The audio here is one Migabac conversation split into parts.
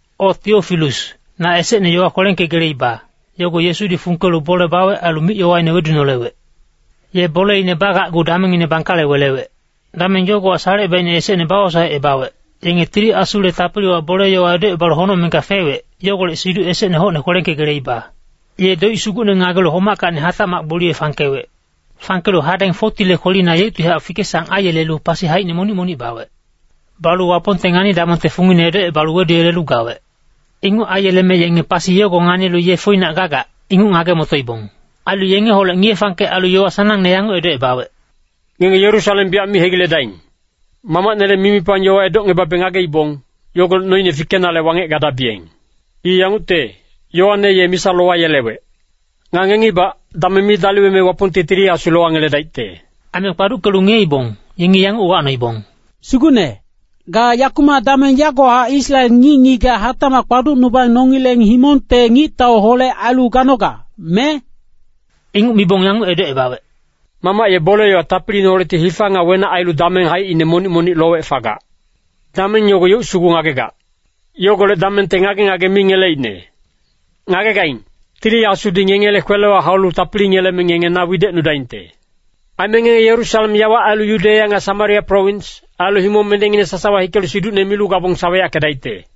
O Tiofilus, na esecne yowa kwelengkegeleiba, yogo Yesudi fungkelu bole bawec ailu mic-yowaine wedunolewec. Ye boleine bagacgu damengngine bangkale welewec. Dameng yogowa salecebaicne esecne bawosaecebawec, yenge Tili Asule tapiliwa bole-yowa edocebalu honocmengka fewec, yogolec siduc esecne hocne kwelengkegeleiba. Ye doic sugucne ngagelu homackacni hatacmac gboliye fangkewec. Fangkelu hadeng 40le kwelina yeuctihac fike-sang aiyelelu pasi haicine monic-monic bawec. Balu Wapongte ngani-damongte fungine edocebalu weduyelelu gawec. Inguc aiyeleme yenge pasi yogo nganilu ye foinac gagac, inguc ngage-motoibong. Ailu yengeholec ngiye-fangkec ailu yowa sanangne yanguc edocebawec, “Ngenge Yerusalem biyac mi hegiledaing. Mamacnele mimipang yowa edocngebabe ngageibong, yogolec noine fikenale wangec gadabiyeng. I yangucte, Yoane ye misa lowayelewec. Nga ngengibac, dameng mi daliweme Wapongti Tili Asu lowangeledaicte.” Aime kpaduckelu ngiyeibong, yengi yanguc uwacnoibong, “Sugucne, ga yakumac dameng yagowahac Israel ngic-ngigac hatacmac kpaducnubang nongileng himongte ngictauholec ailu ganoga, me?” Inguc mibong yanguc edocebawec, “Mamac ye bole-yowa tapiliineholecti hifa nga wenac ailu dameng haicine monic-monic lowec fagac. Dameng yogo yeuc sugu ngagegac. Yogolec damengte ngage-ngage mi ngeleicne. Ngagegaing, Tili Asudi ngengele kwelewa haulu tapili ngeleme ngenge na widecnudaingte. Aime ngenge Yerusalem yawa ailu Yudeya nga Samaria prowins, ailu himong mendengine sasawa hikelu siducne milu gabong saweyackedaicte.”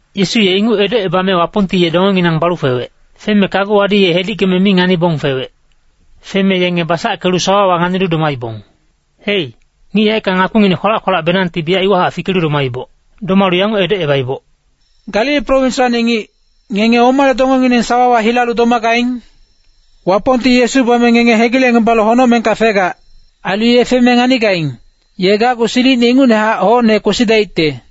Yesu ye inguc edocebame Wapongti ye dongenginang balu fewec. Feme kaguwadi ye hedickeme mi nganibong fewec. Feme yenge basackelu sawawa nganilu domaibong. Hei, ngic yaeckang ngakpinginec kwalac-kwalacbenangti biyac iwahac fikelu domaiboc. Domalu yanguc edocebaiboc, “Galili prowinswacni ngic, ngenge omale dongengineng sawawa hilalu domagaing? Wapongti Yesu bame ngenge hegilecngebalu honocmengka fegac. Ailu ye feme nganigaing, ye gacgu silicine ingucnehac hocne kwesidaicte.”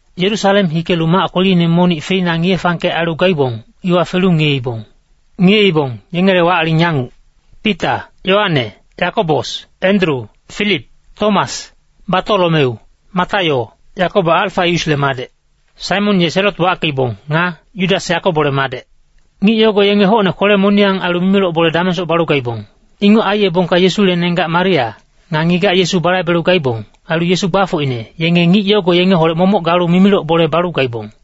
Yerusalem hikelu mac kweline monic feina ngiye-fangkec ailu gaibong, iwa felu ngiyeibong. Ngiyeibong, yengele wac-aling yanguc: Pita, Yoane, Yakobos, Endru, Filip, Tomas, Batolomeu, Mataio, Yakobo Alfaiusle madec, Saimon ye Selot wackeibong, nga Yudas Yakobole madec. Ngic yogo yenge hocne kwele-moniyang ailu mimiloc bole damengsoc balu gaibong. Inguc aiyebongka Yesule nenggac Maria, nga ngigac Yesu balaibelu gaibong, ailu Yesu gbafocine, yenge ngic yogo yengeholec momoc galu mimiloc bole balu gaibong.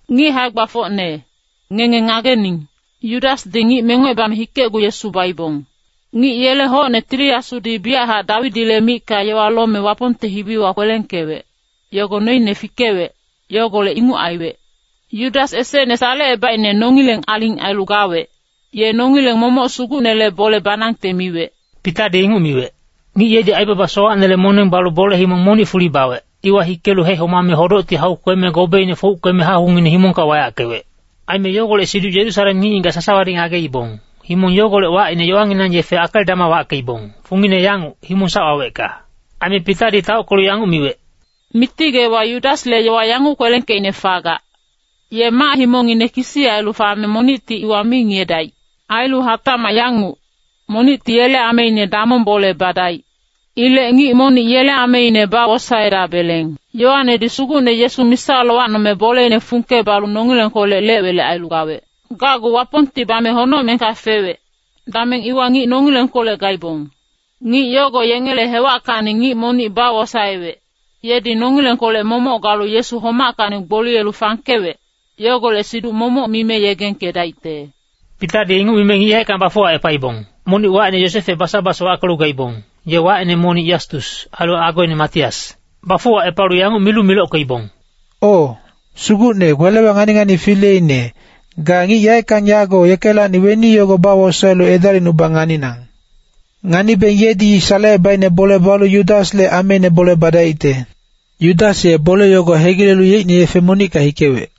“Ngic hae-gbafocne, ngenge ngagening. Yudasdi ngic mengocebame hikecgu Yesu baibong. Ngic yele hocne Tili Asudi biyachac Dawidile micka yowa lome Wapongte hibiwa kwelengkewec, yogo noine fikewec, yogolec inguc aiwec. Yudas esecne salecebaicne nongileng aling ailu gawec, ye nongileng momoc Sugucnele bole banangte miwec.” Pitadi inguc miwec. (Ngic yedi aibaba sowacnele moneng balu bole himong monic fuli bawec, iwa hikelu hehomame hodocti hau kweme gobeine fouckeme hahungngine himongka wayackewec. Aime yogolec siduc Yerusalem ngic-ngigac sasawadi ngageibong, himong yogolec wacine yowanginang yefe Akeldama wackeibong, fungine yanguc, Himong sac wawecka.) Aime Pitadi taockelu yanguc miwec, “Miti Geewa Yudasle yowa yanguc kwelengkeicne fagac, ‘Ye mac-himongine kisi ailu fame monicti iwa mi ngiyedaic.’ Ailu hatacmac yanguc, ‘Monicti yele ameine damong bole badaic.’ Ilec ngic monic yele ameine bawosaedabeleng. Yoanedi Sugucne Yesu misa lowacnome boleine fungke balu nongilengkolec lec-welec ailu gawec. Gacgu Wapongti bame honocmengka fewec, dameng iwa ngic nongilengkolec gaibong. Ngic yogo yengele hewackacni ngic monic bawosaewec, yedi nongilengkolec momoc galu Yesu homackacni gboliyelu fangkewec, yogolec siduc momoc mime yegengkedaicte.” Pitadi inguc mime ngic yaeckang bafuwacepaibong. Monic wacine Yosefe Basabas wackelu gaibong, ye wacine monic Yastus, ailu agoine Matias. Bafuwacepalu yanguc milu milockeibong, “O, Sugucne kwelewa ngani-ngani fileine, ga ngic yaeckang yago yekelacni weni yogo bawosaelu edalicnubang nganinang. Nganibeng yedi salecebaicne bole balu Yudasle ameine bole badaicte. Yudas ye bole yogo hegilelu yeicne yefe monicka hikewec.”